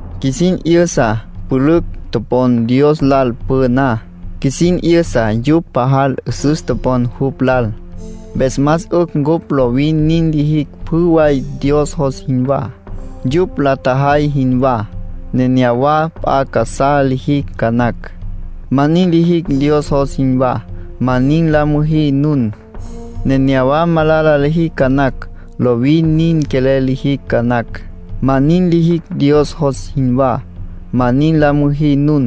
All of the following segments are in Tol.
Qjuisin 'yüsa pülücj topon Dios lal püná. Qjuisin 'yüsa yupj pajal 'üsüs topon jupj lal. Mpes más 'ücj cupj lovin nin lijicj pjü way Dios jos jinwá, yupj la tjajay jinwá. Nenéyawa p'a casá lijicj ca nacj, ma nin lijicj Dios jos jinwá. Ma nin la müjí nun. Nenéyawa malala lijicj ca nacj, lovin nin quelel lijicj ca nacj. Ma nin lijicj Dios jos jinwá. Ma nin la müjí nun.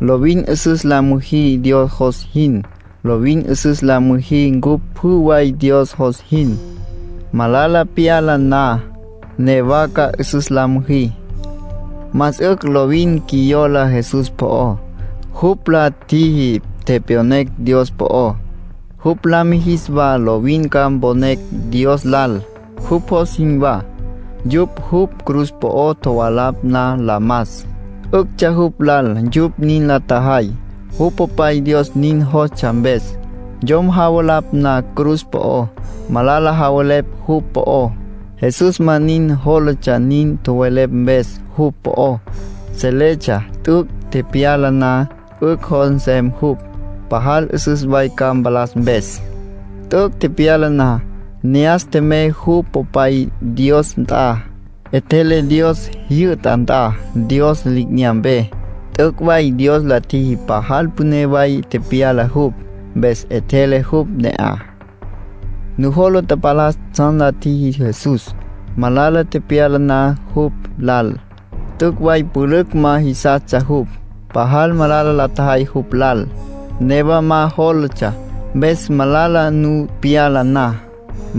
Lovin 'üsüs la müjí Dios jos jin. Lovin 'üsüs la mijicj cupj pjü way Dios jos jin. Malala pyala na, newa ca 'üsüs la müjí. Más 'ücj lovin qjuiyola Jesús po'ó. Jupj la tjiji tepyonecj Dios po'ó. Jupj la mijis wa lovin ca mponecj Dios lal, jupj jos jinwá. Yupj jupj cruz po'o tjovalapj na la mas, 'üctsja jupj lal yupj nin la tjajay, jupj Popay Dios nin jostsja mpes. Yom javalapj na cruz po'ó, malala javelepj jupj po'ó. Jesús ma nin jólatsja nin tjowelepj mpes jupj po'ó. Seletsja t'üc' tepyala na 'ücj jos nsem jupj, pajal 'üsüs way ca mpalas mpes. T'üc' tepyala na, ne'as tjemey jupj Popay Dios nt'a. 'Etjele Dios jyü'ta nt'a, Dios li'inyampe. T'üc' way Dios la tjiji pajal püné way tepyala jupj, mpes 'etjele jupj ne'aj. Nujola tapalas tsjan la tjiji Jesús, malala tepyala na jupj lal. T'üc' way pülücj ma jisastsja jupj. Pajal malala la tjajay jupj lal, newa ma jólatsja. Mpes malala nu pyala na,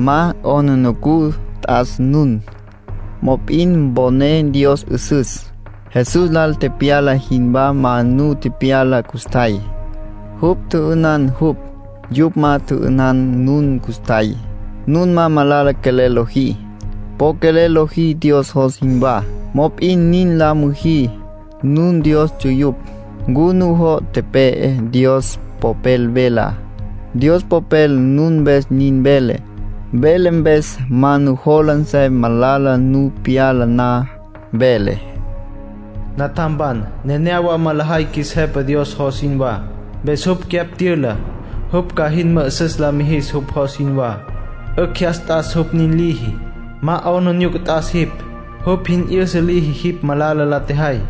ma 'aplijila t'as nun. Mop'in mponé Dios 'üsüs. Jesús lal tepyala jinwá ma nu tepyala custjay. Yupj tjü'ünan jupj. Yupj ma tjü'ünan nun custjay. Nun ma malala quelel lojí. Po quelel lojí Dios jos jinwá. Mop'in nin la müjí. Nun Dios ts'uyupj. ¿Ncu nujo' tepe'e Dios Popel velá? Dios Popel nun mpes nin vele. Vele mpes ma nujola nsem malala nu pyala na. Vele: “Natjam, nenéyawa ma lejay qjuis Jepa Dios jos jinwá. Mpes jupj cyapj tyüla, jupj ca jin mü'üsüs la mijis jupj jos jinwá. 'Ücj jyas t'as jupj nin liji. Ma 'aplijila t'as jipj, jupj jin 'yüsa liji jipj malala la tjejay.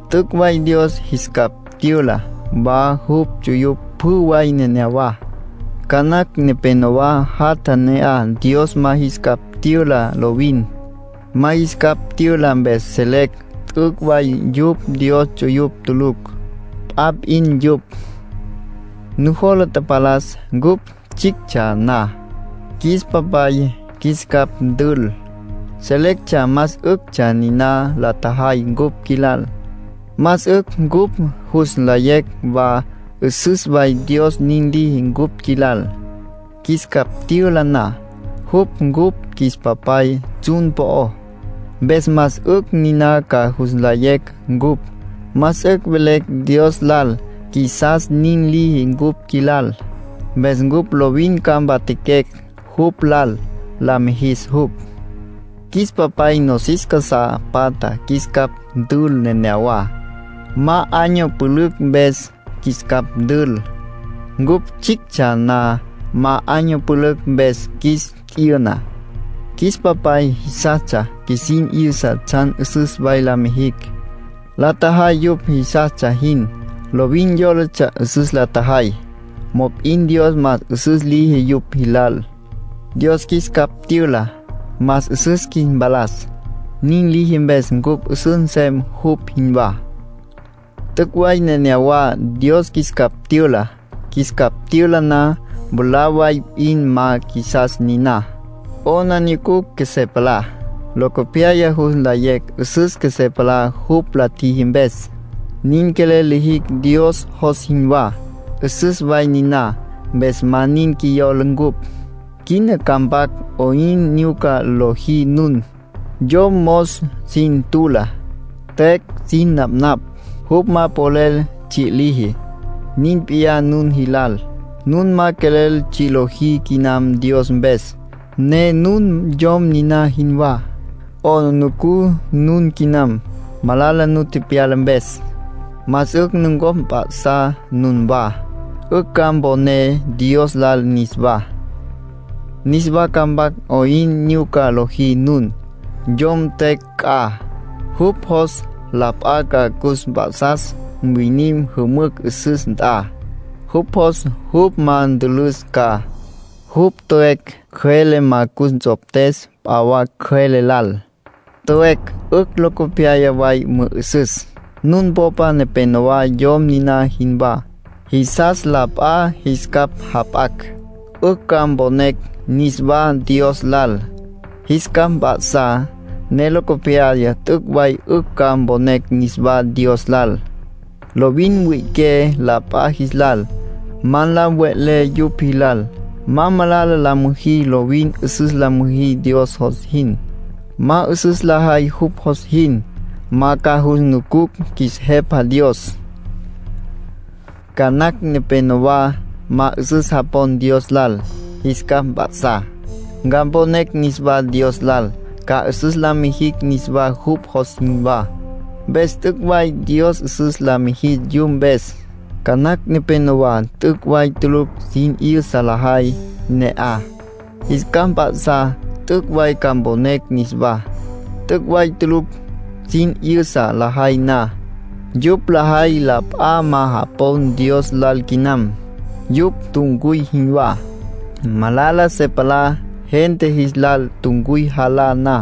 T'üc' way Dios jis capj tyüla wa jupj ts'uyupj pjü way neneyawá. Ca nacj nepénowa jatja ne'aj Dios ma jis capj tyüla lovin. Ma jis capj tyüla mpes selecj t'üc' way yupj Dios ts'uyupj tulucj. P'a p'in yupj. Nujola tapalas cupj tsjictsja na, qjuis papay qjuis capj tül. Selectsja más 'üctsja niná la tjajay cupj qjuilal. Más 'ücj cupj jus nlayecj wa 'üsüs way Dios nin liji cupj qjuilal, qjuis capj tyüla na. Jupj cupj qjuis Papay tsjun po'ó, mpes más 'ücj niná ca jus nlayecj cupj. Más 'ücj velecj Dios lal qjuisas nin liji cupj qjuilal. Mpes cupj lovin ca mpatjaquecj jupj lal, la mijis jupj. Qjuis papay nosis casá patja qjuis capj tül neneyawá. Ma año pülücj mpes qjuis capj tül; cupj tsjictsja na ma año pülücj mpes qjuis t'yüna. Qjuis papay jisastsja qjuisin 'yüsa tsjan 'üsüs way la mijicj. La tjajay yupj jisastsja jin, lovin yólatsja 'üsüs la tjajay. Mop'in Dios más 'üsüs liji yupj jis lal. Dios qjuis capj tyüla, más 'üsüs qjuis mpalas. Nin liji mpes cupj 'üsüs nsem jupj jinwá. T'üc' way nenéyawa Dios qjuis capj tyüla. Qjuis capj tyüla na, mwalá way p'in ma qjuisas niná, 'aplijila qjuesé palá. Locopyaya jus nlayecj 'üsüs qjuesé palá jupj la tjiji mpes. Nin quelel lijicj Dios jos jinwá; 'üsüs way niná. Mpes ma nin qjuiyola cupj. Quina ca mpac 'oyn nyuca lojí nun. Yom mos sin tula, tüecj sin napnapj, jupj ma polel tsji' liji. Nin p'iyá nun jilal. Nun ma quelel tsji' lojí quinam Dios mpes, ne nun yom niná jinwá. 'Aplijila nun quinam, malala nu tepyala mpes. Más 'ücj nucopj mp'a'sá nunwá, 'ücj ca mponé Dios lal niswá. Niswa ca mpac 'oyn nyuca lojí nun. Yom tüecj c'a, jupj jos la p'a ca cus mp'a'sas mwinim jümücj 'üsüs nt'a. Jupj jos jupj ma ntülüs ca, jupj tüecj cjüele ma cus nts'optes p'a wa cjüele lal. Tüecj 'ücj locopyaya way mü'ü'süs. Nun popa nepenowá yom niná jinwá. Jisas la p'a jis capj jap'acj, 'ücj ca mponecj niswá Dios lal. Jis capj mp'a'sá, ne locopyaya t'üc' way 'ücj ca mponecj niswá Dios lal. Lovin mwi'iqué la p'a jis lal, ma la mve'lé yupj jilal. Ma malala la müjí. Lovin 'üsüs la müjí Dios jos jin. Ma 'üsüs lajay jupj jos jin, ma ca jus nucucj qjuis Jepa Dios. Ca nacj nepénowa ma 'üsüs japon Dios lal. Jis capj mp'a'sá, ca mponecj niswá Dios lal, ca 'üsüs la mijicj niswá jupj jos jinwá. Mpes t'üc' way Dios 'üsüs la mijis yupj mpes. Ca nacj nepénowa t'üc' way tulucj sin 'yüsa lajay ne'aj. Jis capj mp'a'sá t'üc' way ca mponecj niswá. T'üc' way tulucj sin 'yüsa lajay na, yupj lajay la p'a ma japon Dios lal quinam. Yupj tuncuy jinwá. Malala se palá gente jis lal tuncuy jalá na.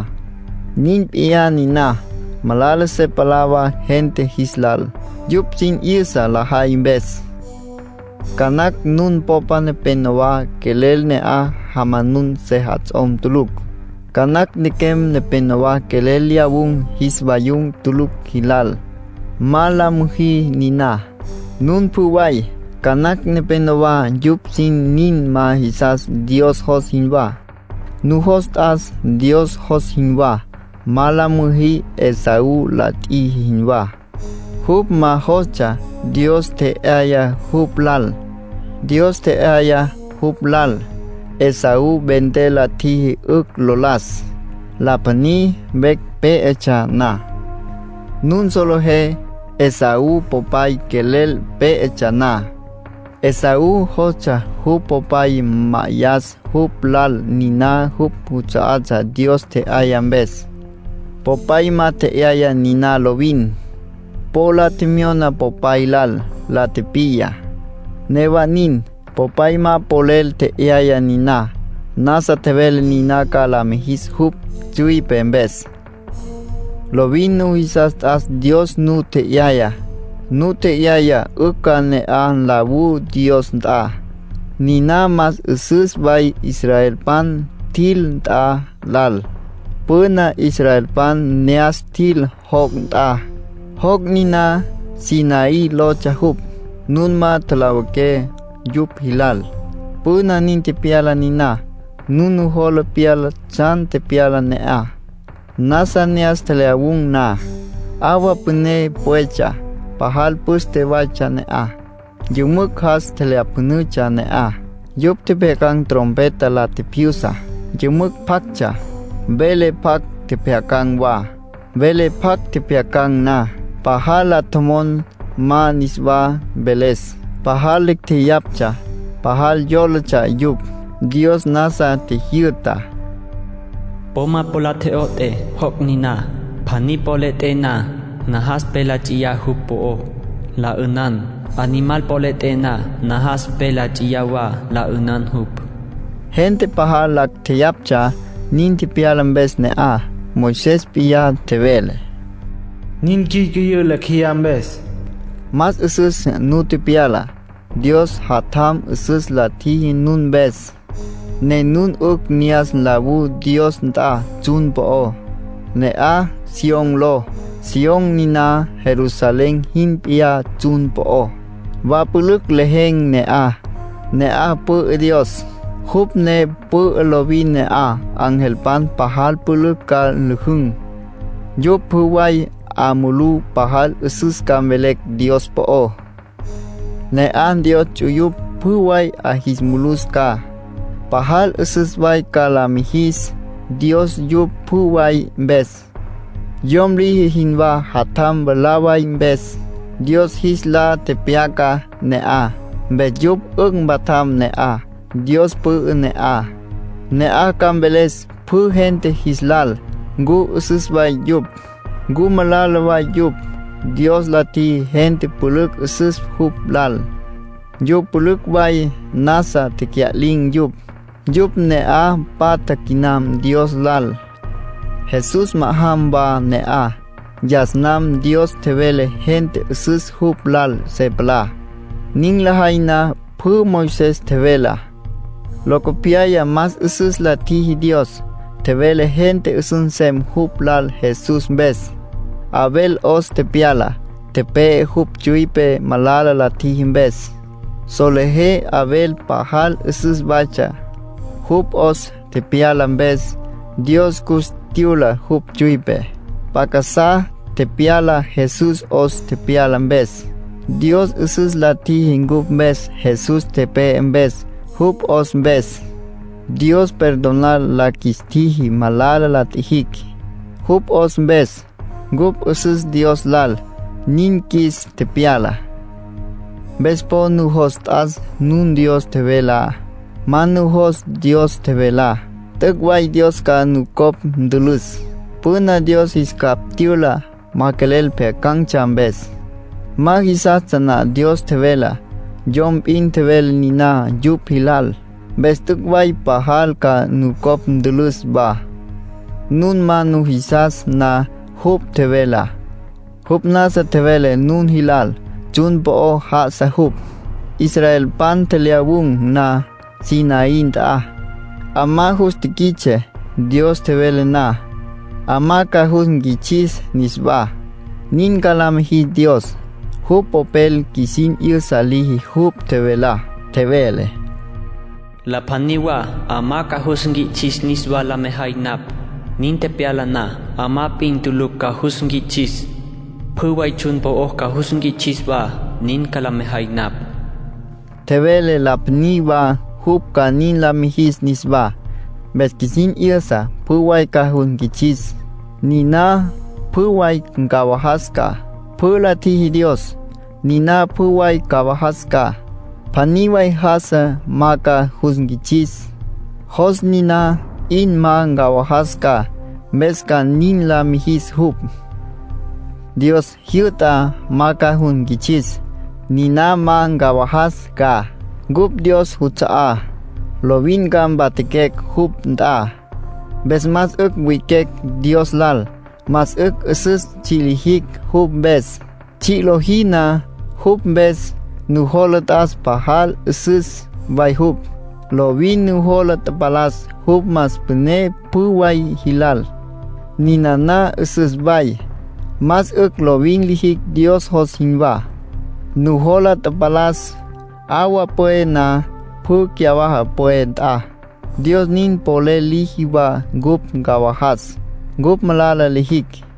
Nin p'iyá niná, malala se palá wa gente jis lal, yupj sin 'yüsa lajay mpes. Ca nacj nun popa nepénowa quelel ne'aj jamanun sejats'om tulucj. Ca nacj nequem nepénowa quelel lyawun̈ jis vayum tulucj jilal. ¡Ma la müjí niná, nun pjü way! Ca nacj nepénowa yupj sin nin ma jisas Dios jos jinwá. ¡Nujos t'as Dios jos jinwá! Ma la müjí Esaú la tjiji jinwá. Jupj ma jostsja Dios tje'yaya jupj lal. Dios tje'yaya jupj lal, Esaú vender la tjiji 'ücj lo las, la pjaní vecj pé'etsja na. Nun solejé Esaú popay quelel pé'etsja na, Esaú jostsja jupj popay ma'ayas jupj lal niná jupj juts'a'atsja Dios tje'yaya mpes. Popay ma tje'yaya niná lovin. Po la tjemyona popay lal, la tipiya; newa nin, popay ma polel tje'yaya niná. Nasa tjevele niná ca la mijis jupj tsüipe mpes. Lovin nujisas t'as Dios nu tje'yayá. Nu tje'yaya 'ücj ca ne'aj nlawú Dios nt'a. Niná más 'üsüs way israelpan tjil nt'a lal. Püna israelpan ne'as tjil joc' nt'a, joc' niná Sinaí lotsja jupj. Nun ma tjalawiqué yupj jilal. Püna nin tepyala niná. Nun nujola pyala tsjan tepyalá ne'aj. Nasa ne'as tjelyawun̈ na, 'awa püné pwetsja. Pajal püste waytsja ne'aj. Yümücj jas tjelyapjünütsja ne'aj. Yupj tjepjyacan̈ trompeta la tjipjyusa, yümücj pjactsja. Vele pjac tjepjyacan̈ wa. Vele pjac tjepjyacan̈ na, pajal la tjomon ma niswa mveles; pajal lacj tjeyaptsja, pajal yólatsja yupj. Dios nasa tjijyü'ta: “Po ma po la tjo'ot'é joc' niná. Pjaní po le 'et'é na, najas pe la nts'iyá jupj po'ó, la 'ünan. Animal po le 'et'é na, najas pe la nts'iyá wa la 'ünan jupj”, nin tjevele. Gente pajal lacj tjeyaptsja nin tepyala mpes ne'aj. Moisés p'iyá tjevele: “Nin cyücüyǘ lecj jeyá mpes”. Más 'üsüs nu tepyala. Dios Jatjam 'üsüs la tjiji nun mpes, ne nun 'ücj ne'as nlawú Dios nt'a tsjun po'ó. Ne'aj Sión ló. Sión niná Jerusalén jin p'iyá tsjun po'ó. Wa pülücj lejen̈ ne'aj. Ne'aj pü'ü Dios, jupj ne pü'ü lovin. Ne'aj angelpan pajal pülücj ca nlüjün̈, yupj pjü way 'a mulú pajal 'üsüs ca mvelecj Dios po'ó. Ne'aj Dios ts'uyupj pjü way 'a jis mulus ca. Pajal 'üsüs way ca la mijis Dios yupj pjü way mpes, yom liji jinwá jatjam mwalá way mpes. Dios jis lá tepyaca ne'aj, mpes yupj 'ücj mpatjam ne'aj. Dios pü'ü ne'aj. Ne'aj ca mveles pjü gente jis lal ncu 'üsüs way yupj, ncu malala way yupj. Dios la tjiji gente pülücj 'üsüs jupj lal, yupj pülücj way nasa tecya'lin̈ yupj. Yupj ne'aj patja quinam Dios lal. Jesús ma'ajam wa ne'aj. Yas nam Dios tjevele gente 'üsüs jupj lal se palá, nin lajay na pjü Moisés tjevelá. Locopyaya más 'üsüs la tjiji Dios. Tjevele gente 'üsüs nsem jupj lal Jesús mpes. Abel 'os tepyala, tepe'e, jupj tsüipe malala la tjiji mpes. Solejé Abel pajal 'üsüs waytsja. Jupj 'os tepyala mpes, Dios cus tyüla jupj tsüipe. P'a casá tepyala Jesús 'os tepyala mpes. Dios 'üsüs la tjiji cupj mpes Jesús tepe'e mpes. Jupj 'os mpes, Dios perdonar la qjuis tjiji malala la tjijicj. Jupj 'os mpes, cupj 'üsüs Dios lal, nin qjuis tepyala. Mpes po nujos t'as nun Dios tjevelá. Ma nujos Dios tjevelá, t'üc' way Dios ca nucopj ntülüs. Püna Dios jis capj tyüla ma quelel pjyacan̈tsja mpes; ma jisastsja na Dios tjevelá. Yom p'in tjevele niná yupj jilal. Mpes t'üc' way pajal ca nucopj ntülüs wa, nun ma nujisas na jupj tjevelá. Jupj nasa tjevele nun jilal, tsjun po'o já'asa jupj. Israelpan tjelyawun̈ na Sinaí nt'a, 'amá jus tiquits'e Dios tjevele na. 'Amá ca jus nquits'is niswá, nin ca la mijis Dios. Jupj Popel qjuisin 'yüsa liji jupj tjevelá. Tjevele: “La pjaní wa 'amá ca jus nquits'is niswá la mejay napj. Nin tepyala na, 'amá p'in tulucj ca jus nquits'is. Pjü way tsjun po'o ca jus nquits'is wa, nin ca la mejay napj.” Tjevele la pjaní wa jupj ca nin la mijis niswá. Mpes qjuisin 'yüsa pjü way ca jus nquits'is, niná pjü way ncawajas ca. Pjü la tjiji Dios, niná pjü way ncawajas ca. Pjaní way já'asa ma ca jus nquits'is. Jos niná p'in ma ncawajas ca, mpes ca nin la mijis jupj. Dios jyü'tá ma ca jus nquits'is. Niná ma ncawajas ca. Cupj Dios juts'a'á, lovin ca mpatjaquecj jupj nt'a. Mpes más 'ücj wi'iquecj Dios lal. Más 'ücj 'üsüs tsji' lijicj jupj mpes. Tsji' lojí na jupj mpes, nujola t'as pajal 'üsüs way jupj. Lovin nujola tapalas jupj más püné pjü way jilal. Ninana 'üsüs way. Más 'ücj lovin lijicj Dios jos jinwá. Nujola tapalas, 'awa pwe na pjü cyawaja pwe nt'a. Dios nin polel liji wa cupj ncawajas, cupj malala lijicj.